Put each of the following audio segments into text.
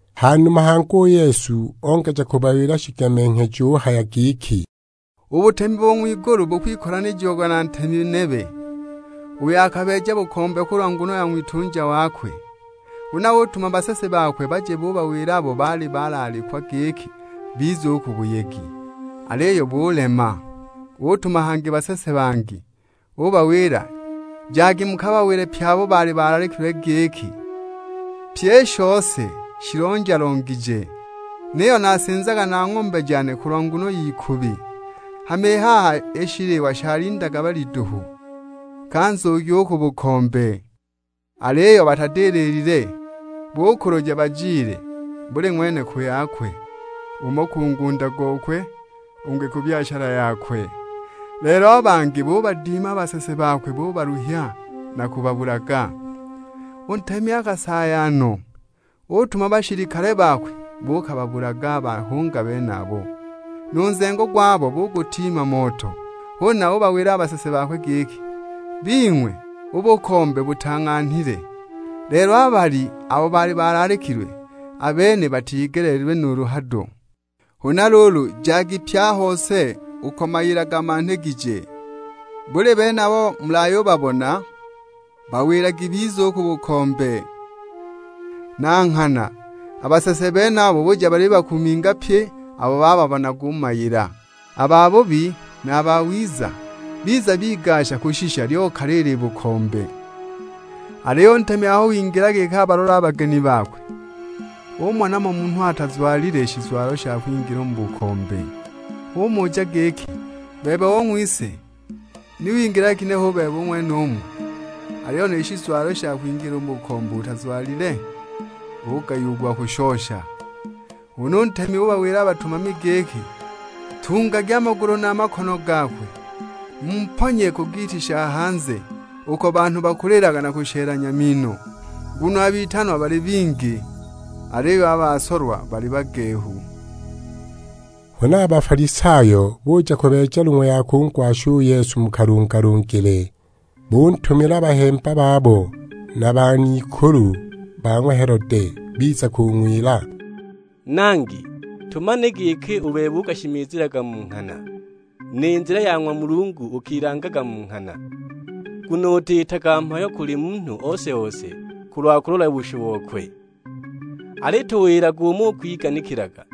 Ha numa hangi u Yesu ongeja kubawila shigemenghejo; uhaya giki, "U butemi bo ng'wigulu tukuwikolanija na ntemi nebe, uyo akabeeja bukombe kulwa nguno ya ng'witunja wakwe. Huna utuma basese bakwe baje bubawila abo baali balaalikwa giki bize u ku buyegi; aliyo bulema! Utuma hangi basese bangi; ubawila, 'Jagi mukabawile pye abo baali balaalikilwe giki: Pyi i shose shilonja-longije; niyo nasinzaga na ng'ombe jane kulwa nguno y'ikubi, hama i haha i shiliwa shalindaga balyi duhu. Ka nzugi u ku bukombe!' Aliyo batadililile; bukuluja bajile, buli ng'wene ku yakwe. Umo ku ngunda gokwe, ungi ku byashala yakwe. Lelo a bangi bubadima a basese bakwe bubaluhya na kubabulaga! U ntemi akasaaya no, utuma bashilikale bakwe buukababulaga a bahunga benabo, nu nzengo gwabo bugutiima moto. Huna ubawila a basese bakwe giki, 'Bing'we; u bukombe butang'anhilile, lelo a balyi abo baali balaalikilwe, a bene batigeleelilwe nuulu hado. Huna luulu jagi pye a hose uko mayila gamanhigije; buli bene abo mulayubabona bawilagi bize u ku bukombe.' Na nghana a basese benabo buja balibakuminga pye abo bababonaga u mu mayila, a babubi na a bawiza. Biza bigasha kushisha, lyokala i libukombe! "Aliyo u ntemi aho wingila giki abalole a bageni bakwe, ubona mo munhu atazwalile shizwalo sha kwingilila u mu bukombe! Umuja giki, 'Bebe ong'wise, ni wingilaga ginehe u bebe u ng'wenumu, aliyo ni shizwalo sha kwingilila u mu bukombe utazwalile?' Ugayiwa u gwa kushosha! Huna u ntemi ubawila a batumami giki, 'Ntungagi a magulu na a makono gakwe, mumponye ku giiti sha hanze; uko banhu bakulila na kushelanya mino!' Nguno a bitanwa bali bingi, aliyo a basolwa bali bagehu!" Huna a Bafalisayo buja kubeeja long'we ya kungwasha u Yesu mu kalungalungile. Buntumila bahemba babo na ban'ikulu ba ng'wa Helode. Biza kung'wila, "Nangi, tumanile giki u bebe ukashimizilaga mu nghana, ni nzila ya ng'wa Mulungu ukilangaga mu nghana; nguno utiitaga mhayo kuli munhu ose-ose kulwa kulola bushu bokwe. Alituwilage umo ukwiganikilaga,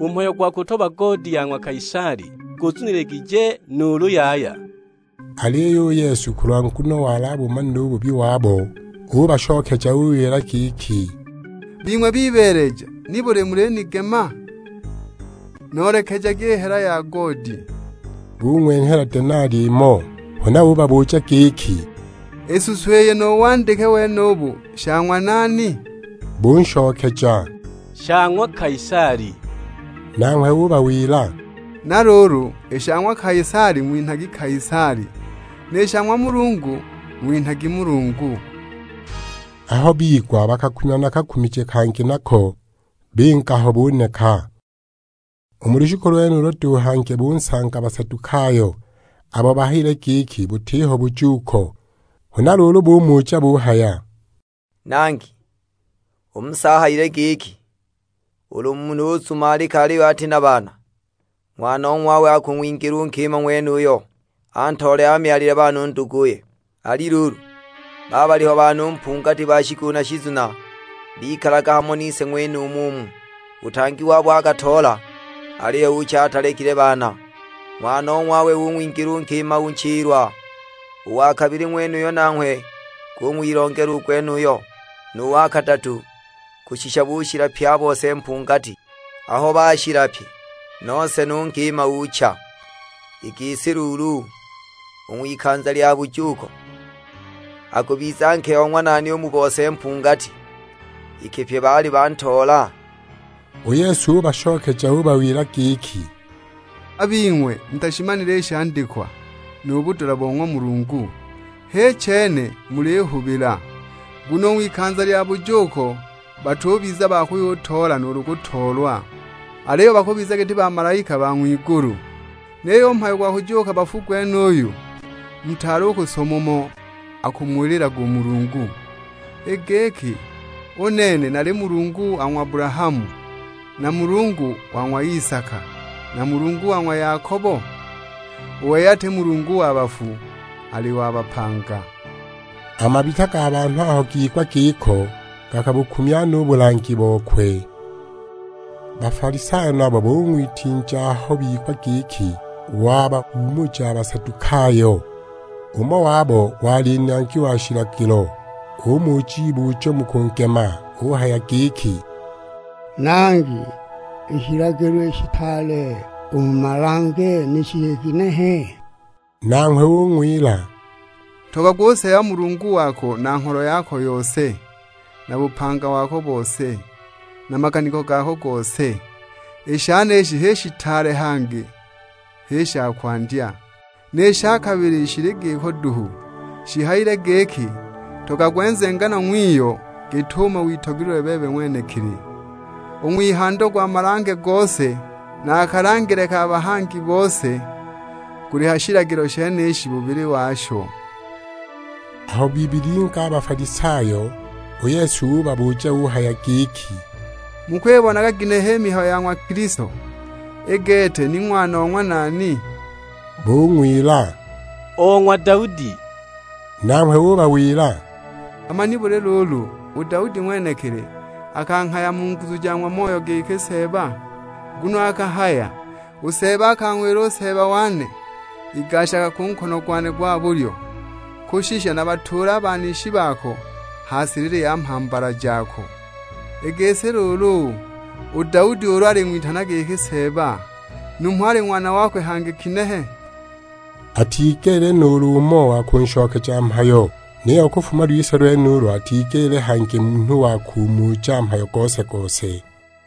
u mhayo gwa kutoba goodi ya ng'wa Kaisali guzuniligije, nuulu yaya?" Aliyo u Yesu kulwa nguno wali abumanile u bubi wabo, ubashokeja ubawila giki, "Bing'we bibeeleja, nibuli mulinigema? Noolekejagi i hela ya goodi." Bung'wenhela denali imo. Huna ubabuja giki, "I suso iyi nu wandike wenubu sha ng'wa nani?" Bunshokeja, "Sha ng'wa Kaisali." Nanghwe ubawila, "Na luulu, i sha ng'wa Kaisali ng'winhagi Kaisali; ni sha ng'wa Mulungu ng'winhagi Mulungu." Aho bigwa bakakumya na kakumije kangi nako, binga ho buneka. U mu lushiku lwenulo duhu hangi bunsanga Basadukayo; abo bahayile giki butiho bujuuko. Huna luulu bumuja buhaya, "Nangi, u Musa ahayile giki, ulu munhu uzumalika aliyo ati na baana, ng'wanong'wawe akung'wingila u nkima ng'wenuyo, antoole amyalile baana u nduguye. Ali luulu, baaliho banhu mpungati ba shikulu na shizuna, bikalaga hamo nise ng'wenumu umu; u tang@i wabo akatoola, aliyo ucha atalekile baana, ng'wanong'wawe ung'wingila u nkima u nchilwa. U wa kabili ng'wenuyo nanghwe gung'wilongela u gwenuyo; nu wa kadatu, kushisha bushila pye a bose mpungati! Aho bashila pye, nose nu nkima ucha! I gisi luulu, u ng'wikanza lya bujuuko, akubiza nke o ng'wa nani u mu bose mpungati, iki pye baali bantoola?" U Yesu ubashokeja ubawila giki, "A bing'we mutashimanile i shandikwa, nu budula bo ng'wa Mulungu, h'i chene mulihubila. Nguno u ng'wikanza lya bujuuko batubiza ba kuyutoola nuulu kutoolwa, aliyo bakubiza giti bamalaika ba ng'wigulu. Niyo u mhayo gwa kujuuka bafu gwenuyu, mutaali u kusoma umo akumuwililaga u Mulungu; i giki, 'U nene nali Mulungu wa ng'wa Abulahamu, na Mulungu wa ng'wa Isaka, na Mulungu wa ng'wa Yakobo? U wei ati Mulungu wa bafu, ali wa bapanga.' " A mabita ga banhu aho gigwa giko gakabukumya no u bulangi bokwe. Bafalisayo nabo bung'witinja aho bigwa giki wabahuumuja a Basadukayo. Umo wabo (wali nangi wa shilagilo), umuja ibujo mu kungema; uhaya giki, "Nangi, i shilagilo i shitaale u mu malange ni shili ginehe?" Nanghwe ung'wila, " 'Ntogagwe u Seeba Mulungu wako na ngholo yako yose, na bupanga wako bose, na maganiko gako gose.' I shenishi h'i shitaale, hangi h'i sha kwandya. Ni sha kabili shili giko duhu; shihayile giki, 'Ntogagwe nzenganwa ng'wiyo git'umo witogelilwe bebe ng'wenekili.' U ng'wihando gwa malange gose, na a kalangile ka bahangi bose, guli ha shilagilo shenishi bubili washo." Aho bibilinga a Bafalisayo, u Yesu ubabuja uhaya giki, "Mukwibonaga ginehe i mihayo ya ng'wa Kilisto, i gete ni ng'wana o ng'wa nani?" Bung'wila, "O ng'wa Daudi!" Nanghwe ubawila; "Hama nibuli luulu u Daudi ng'wenekili, akanghaya mu nguzu ja ng'wa Moyo giki Seeba? Nguno akahaya, 'U Seeba akang'wila u Seeba wane, igashaga ku nkono gwane gwa bulyo, kushisha nabatuule a banishi bako ha silili ya mhambala jako.' I gisi luulu, u Daudi ulu aling'witana giki Seeba, numho ali ng'wana wakwe hangi kinehe?" Atigelile nuulu umo wa kunshokeja mhayo; niyo kufuma lwise lwenulo atigelile hangi munhu wa kumuja mhayo gose-gose.